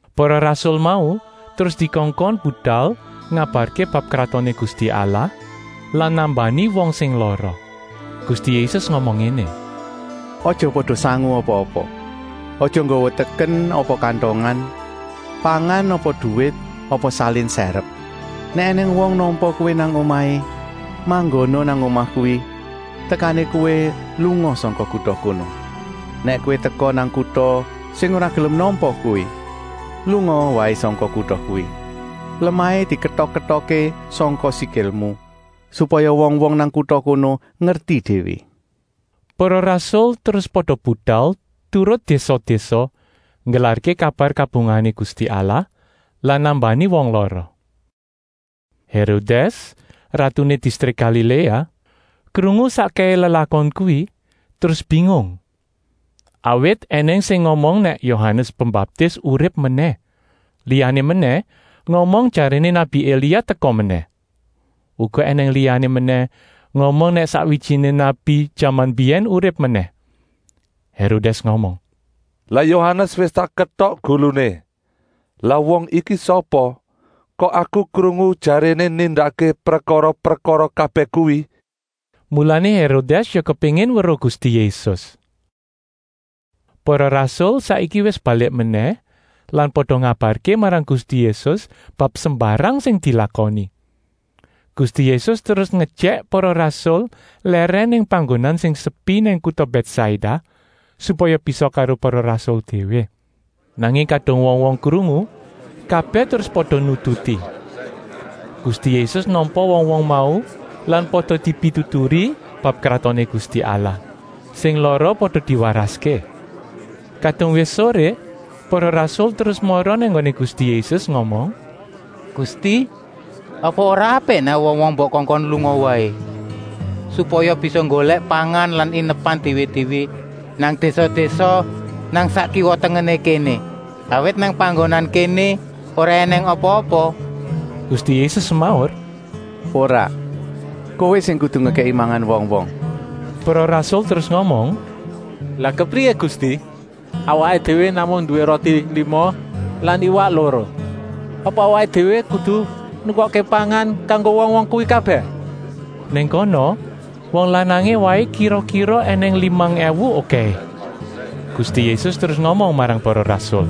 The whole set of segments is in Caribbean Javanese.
Para rasul mau terus dikongkon budal ngabarké bab Kratoné Gusti Allah lan nambani wong sing lara. Gusti Yésus ngomong ngéné: “Aja pada sangu apa-apa. Aja nggawa teken apa kantongan, pangan apa duwit apa salin sèrep. Nèk ènèng wong nampa kowé nang omahé, manggona nang omah kuwi tekané kowé lunga sangka kuta kono. Nèk kowé teka nang kuta sing ora gelem nampa kowé, lungaa waé sangka kuta kuwi. Lemahé diketok-ketokké sangka sikilmu, supaya wong-wong nang kuta kono ngerti déwé.” Para rasul terus pada budal turut désa-désa, nggelarké kabar kabungahané Gusti Allah lan nambani wong lara. Hérodès, ratuné distrik Galiléa, krungu sakkèhé lelakon kuwi, terus bingung. Awit ènèng sing ngomong nèk Yohanes Pembaptis urip menèh. Liyané menèh ngomong jaréné nabi Elia teka menèh. Uga ènèng liyané menèh ngomong nèk sakwijiné nabi jaman mbiyèn urip menèh. Hérodès ngomong: “Lah Yohanes wis tak ketok guluné. Lah wong iki sapa, kok aku krungu jaréné nindakké prekara-prekara kabèh kuwi.” Mulané Hérodès ya kepéngin weruh Gusti Yésus. Para rasul saiki wis balik menèh lan pada ngabarké marang Gusti Yésus bab sembarang sing dilakoni. Gusti Yésus terus ngejèk para rasul lèrèn nang panggonan sing sepi nang kuta Bètsaida, supaya bisa karo para rasul déwé. Nanging kadung wong-wong krungu, kabèh terus pada nututi. Gusti Yésus nampa wong-wong mau lan pada dipituturi bab Kratoné Gusti Allah. Sing lara pada diwaraské. Kadung wis soré para rasul terus mara nang nggoné Gusti Yésus ngomong: “Gusti, apa ora apik nèk wong-wong mbok kongkon lunga waé, supaya bisa nggolèk pangan lan inepan déwé-déwé nang désa-désa nang sak kiwa-tengené kéné, awit nang panggonan kéné ora ènèng apa-apa.” Gusti Yésus semaur: “Ora, kowé sing kudu ngekèki mangan wong-wong!” Para rasul terus ngomong: “Lah kepriyé Gusti, awaké déwé namung nduwé roti lima lan iwak loro. Apa awaké déwé kudu nukokké pangan kanggo wong-wong kuwi kabèh?” Nang kono wong lanangé waé kira-kira ènèng limang èwu okèhé. Gusti Yésus terus ngomong marang para rasul: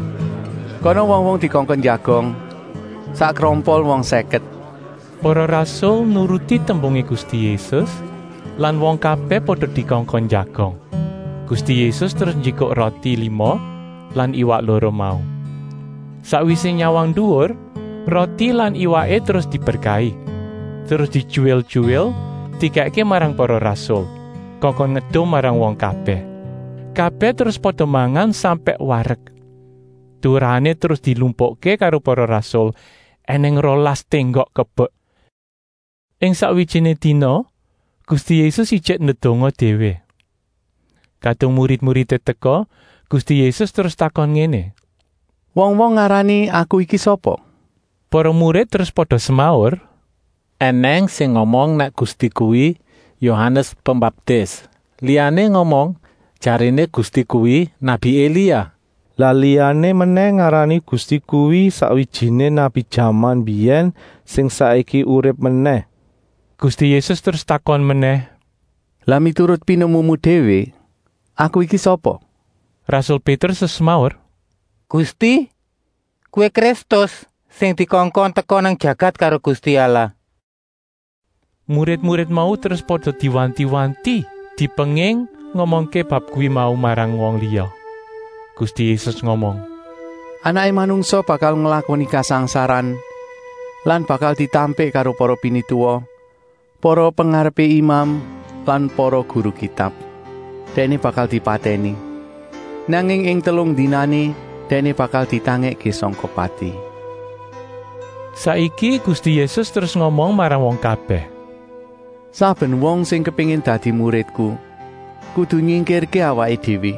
“Kana wong-wong dikongkon njagong, sak krompol wong sèket!” Para rasul nuruti tembungé Gusti Yésus lan wong kabèh pada dikongkon njagong. Gusti Yésus terus njikuk roti lima lan iwak loro mau. Sakwisé nyawang nduwur, roti lan iwaké terus diberkahi, terus dityuwil-tyuwil dikèkké marang para rasul, kongkon ngedum marang wong kabèh. Kabèh terus pada mangan sampèk warek. Turahané terus dilumpukké karo para rasul, ènèng rolas ténggok kebek. Ing sakwijiné dina Gusti Yésus ijik ndedonga déwé. Kadung murid-muridé teka, Gusti Yésus terus takon ngéné: “Wong-wong ngarani Aku iki sapa?” Para murid terus pada semaur: “Enèng sing ngomong nèk Gusti kuwi Yohanes Pembaptis, liyané ngomong jaréné Gusti kuwi nabi Elia. Lah liyané menèh ngarani Gusti kuwi sakwijiné nabi jaman mbiyèn sing saiki urip menèh.” Gusti Yésus terus takon menèh: “Lah miturut pinemumu déwé, Aku iki sapa?” Rasul Pétrus terus semaur: “Gusti, Kowé Kristus, sing dikongkon teka nang jagat karo Gusti Allah!” Murid-murid mau terus pada diwanti-wanti, dipenging ngomongké bab kuwi mau marang wong liya. Gusti Yésus ngomong: “Anaké Manungsa bakal nglakoni kasangsaran lan bakal ditampik karo para pinituwa, para pengarepé imam lan para guru Kitab. Dèkné bakal dipatèni, nanging ing telung dinané Dèkné bakal ditangèkké sangka pati.” Saiki Gusti Yésus terus ngomong marang wong kabèh: “Saben wong sing kepéngin dadi muridku kudu nyingkirké awaké déwé,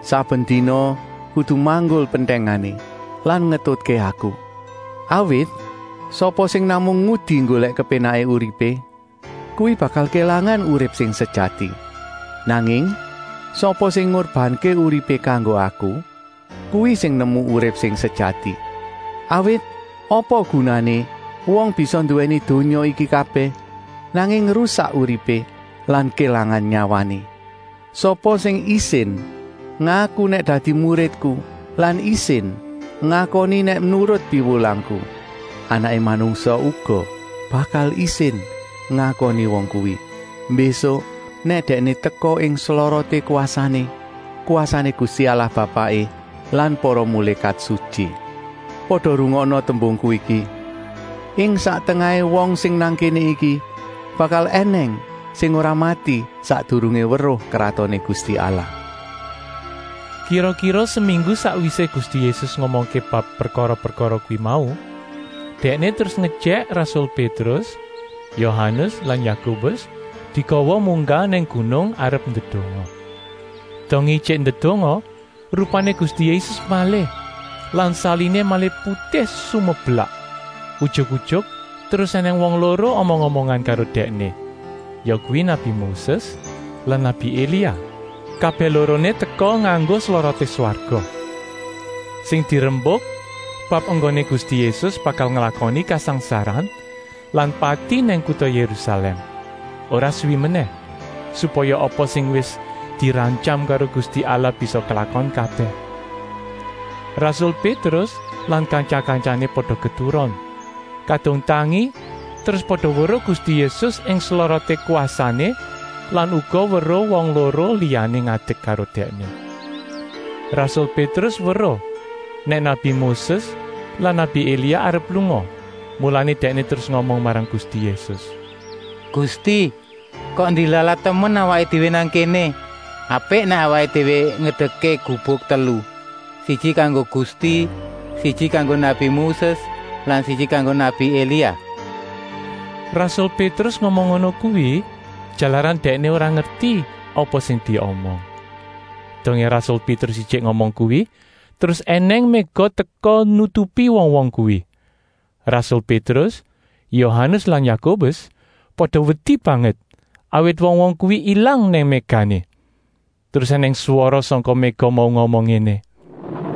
saben dina kudu manggul pentèngané lan ngetutké Aku. Awit sapa sing namung ngudi nggolèk kepénaké uripé, kuwi bakal kélangan urip sing sejati. Nanging sapa sing ngurbanké uripé kanggo Aku, kuwi sing nemu urip sing sejati. Awit apa gunané wong bisa nduwèni donya iki kabèh, nanging rusak uripé lan kélangan nyawané? Sapa sing isin ngaku nèk dadi muridku lan isin ngakoni nèk nurut piwulangku, Anaké Manungsa uga bakal isin ngakoni wong kuwi, mbésuk nèk Dèkné teka ing sloroté kwasané, kwasané Gusti Allah Bapaké lan para mulékat sutyi. Pada rungokna tembungku iki: ing sak tengahé wong sing nang kéné iki bakal ènèng sing ora mati sakdurungé weruh Kratoné Gusti Allah.” Kira-kira seminggu sakwisé Gusti Yésus ngomongké bab prekara-prekara kuwi mau, Dèkné terus ngejèk rasul Pétrus, Yohanes lan Yakobus digawa munggah nang gunung arep ndedonga. Dongé ijik ndedonga, rupané Gusti Yésus malih lan saliné malih putih sumeblak. Ujuk-ujuk terus ènèng wong loro omong-omongan karo Dèkné, yakuwi nabi Moses lan nabi Elia. Kabèh loroné teka nganggo sloroté swarga. Sing dirembuk bab enggoné Gusti Yésus bakal nglakoni kasangsaran lan pati nang kuta Yérusalèm, ora suwi menèh, supaya apa sing wis dirantyam karo Gusti Allah bisa klakon kabèh. Rasul Pétrus lan kantya-kantyané pada keturon. Kadung tangi terus pada weruh Gusti Yésus ing sloroté kwasané lan uga weruh wong loro liyané ngadek karo Dèkné. Rasul Pétrus weruh nèk nabi Moses lan nabi Elia arep lunga, mulané dèkné terus ngomong marang Gusti Yésus: “Gusti, kok ndilalah temen awaké déwé nang kéné. Apik nèk awaké déwé ngedekké gubuk telu: siji kanggo Gusti, siji kanggo nabi Moses lan siji kanggo nabi Elia.” Rasul Pétrus ngomong ngono kuwi, jalaran dèkné ora ngerti apa sing diomong. Dongé rasul Pétrus ijik ngomong kuwi, terus ènèng méga teka nutupi wong-wong kuwi. Rasul Pétrus, Yohanes lan Yakobus pada wedi banget, awit wong-wong kuwi ilang nang mégané. Terus ènèng swara sangka méga mau ngomong ngéné: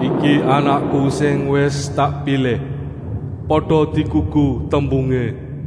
“Iki Anakku sing wis tak pilih. Pada digugu tembungé.”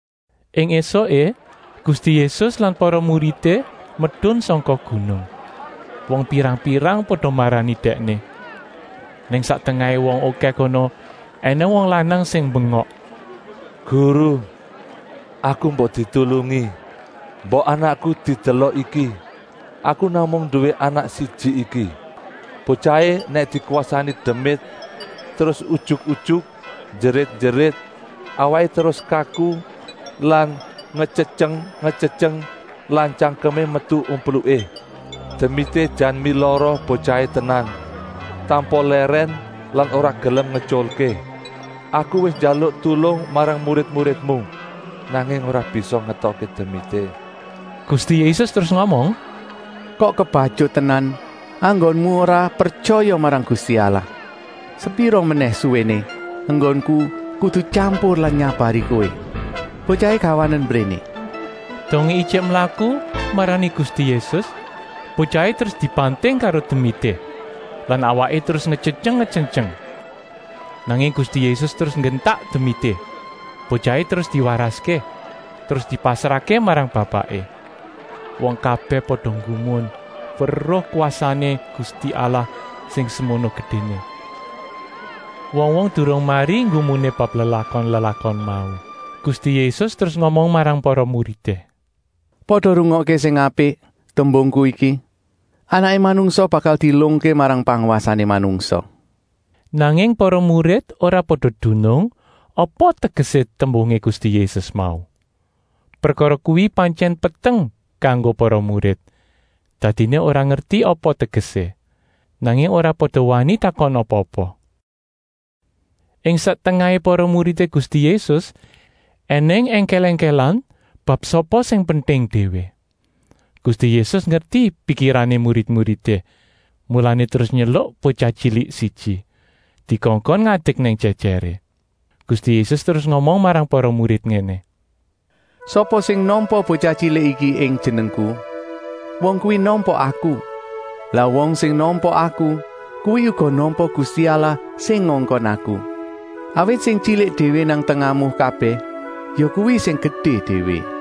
Ing ésuké Gusti Yésus lan para muridé medun sangka gunung. Wong pirang-pirang pada marani Dèkné. Nang sak tengahé wong okèh kono ènèng wong lanang sing mbengok: “Guru, aku mbok ditulungi! Mbok anakku didelok iki, aku namung nduwé anak siji iki. Botyahé nèk dikwasani demit terus ujuk-ujuk njerit-njerit, awaké terus kaku lan ngetyetyeng-ngetyetyeng lan tyangkemé metu umpluké. Demité jan milara botyahé tenan, tanpa lèrèn lan ora gelem ngetyulké. Aku wis njaluk tulung marang murid-muridmu, nanging ora bisa ngetokké demité.” Gusti Yésus terus ngomong: “Kok kebatyut tenan enggonmu ora pretyaya marang Gusti Allah. Sepira menèh suwéné enggonku kudu tyampur lan nyabari kowé? Botyahé gawanen mbréné!” Dongé ijik mlaku marani Gusti Yésus botyahé terus dibanting karo demité lan awaké terus ngetyetyeng-ngetyetyeng. Nanging Gusti Yésus terus nyentak demité. Botyahé terus diwaraské, terus dipasrahké marang bapaké. Wong kabèh pada nggumun weruh kwasané Gusti Allah sing semono gedéné. Wong-wong durung mari nggumuné bab lelakon-lelakon mau. Gusti Yésus terus ngomong marang para muridé: “Pada rungokké sing apik tembungku iki. Anaké Manungsa bakal dielungké marang pangwasané manungsa.” Nanging para murid ora pada dunung apa tegesé tembungé Gusti Yésus mau. Prekara kuwi pantyèn peteng kanggo para murid, dadiné ora ngerti apa tegesé. Nanging ora pada wani takon apa-apa. Ing sak tengahé para muridé Gusti Yésus ènèng èngkèl-èngkèlan bab sapa sing penting déwé. Gusti Yésus ngerti pikirané murid-muridé, mulané terus nyeluk botyah tyilik siji, dikongkon ngadek nang jèjèré. Gusti Yésus terus ngomong marang para murid ngéné: “Sapa sing nampa botyah tyilik iki ing Jenengku, wong kuwi nampa Aku. Lah wong sing nampa Aku kuwi uga nampa Gusti Allah sing ngongkon Aku. Awit sing tyilik déwé nang tengahmu kabèh, yakuwi sing gedé déwé.”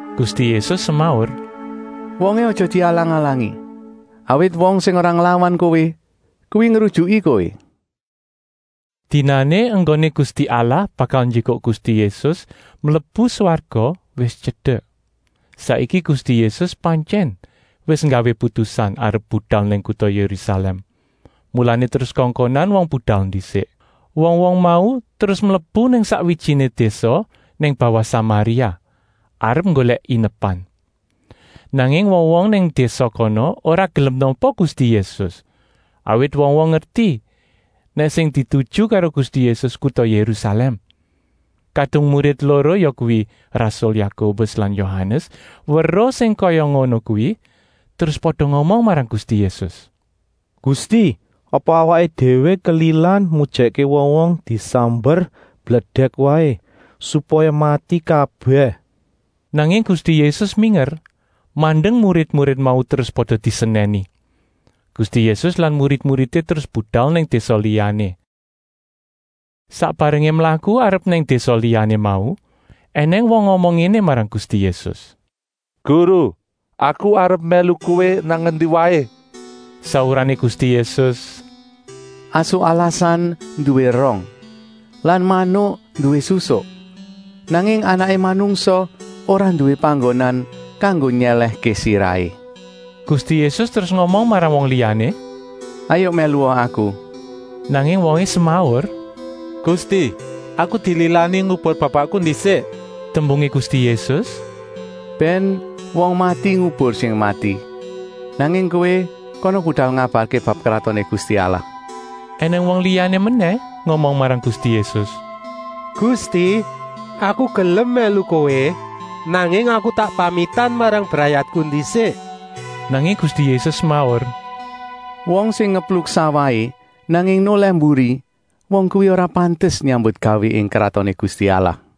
Gusti Yésus semaur: “Wongé aja dialang-alangi. Awit wong sing ora nglawan kowé, kuwi ngrujuki kowé!” Dinané enggoné Gusti Allah bakal njikuk Gusti Yésus mlebu swarga wis tyedek. Saiki Gusti Yésus pantyèn wis nggawé putusan arep budal nang kuta Yérusalèm, mulané terus kongkonan wong budal ndisik. Wong-wong mau terus mlebu nang sakwijiné désa nang bawah Samaria, arep nggolèk inepan. Nanging wong-wong nang désa kono ora gelem nampa Gusti Yésus, awit wong-wong ngerti nèk sing dituju karo Gusti Yésus kuta Yérusalèm. Kadung murid loro, yakuwi rasul Yakobus lan Yohanes, weruh sing kaya ngono kuwi, terus pada ngomong marang Gusti Yésus: “Gusti, apa awaké déwé kelilan mujèkké wong-wong disamber bledèk waé, supaya mati kabèh!” Nanging Gusti Yésus minger mandeng murid-murid mau terus pada disenèni. Gusti Yésus lan murid-muridé terus budal nang désa liyané. Sak barengé mlaku arep nang désa liyané mau, ènèng wong ngomong ngéné marang Gusti Yésus: “Guru, aku arep mèlu Kowé nang endi waé!” Saurané Gusti Yésus: “Asu alasan nduwé rong lan manuk nduwé susuk, nanging Anaké Manungsa ora nduwé panggonan kanggo nyèlèhké sirahé.” Gusti Yésus terus ngomong marang wong liyané: “Hayuk mèlua Aku!” Nanging wongé semaur: “Gusti, aku dililani ngubur bapakku ndisik!” Tembungé Gusti Yésus: “Bèn wong mati ngubur sing mati, nanging kowé kana budal ngabarké bab Kratoné Gusti Allah.” Enèng wong liyané menèh ngomong marang Gusti Yésus: “Gusti, aku gelem mèlu Kowé, nanging aku tak pamitan marang brayatku ndisik!” Nanging Gusti Yésus semaur: “Wong sing ngepluk sawahé, nanging nolèh mburi, wong kuwi ora pantes nyambutgawé ing Kratoné Gusti Allah.”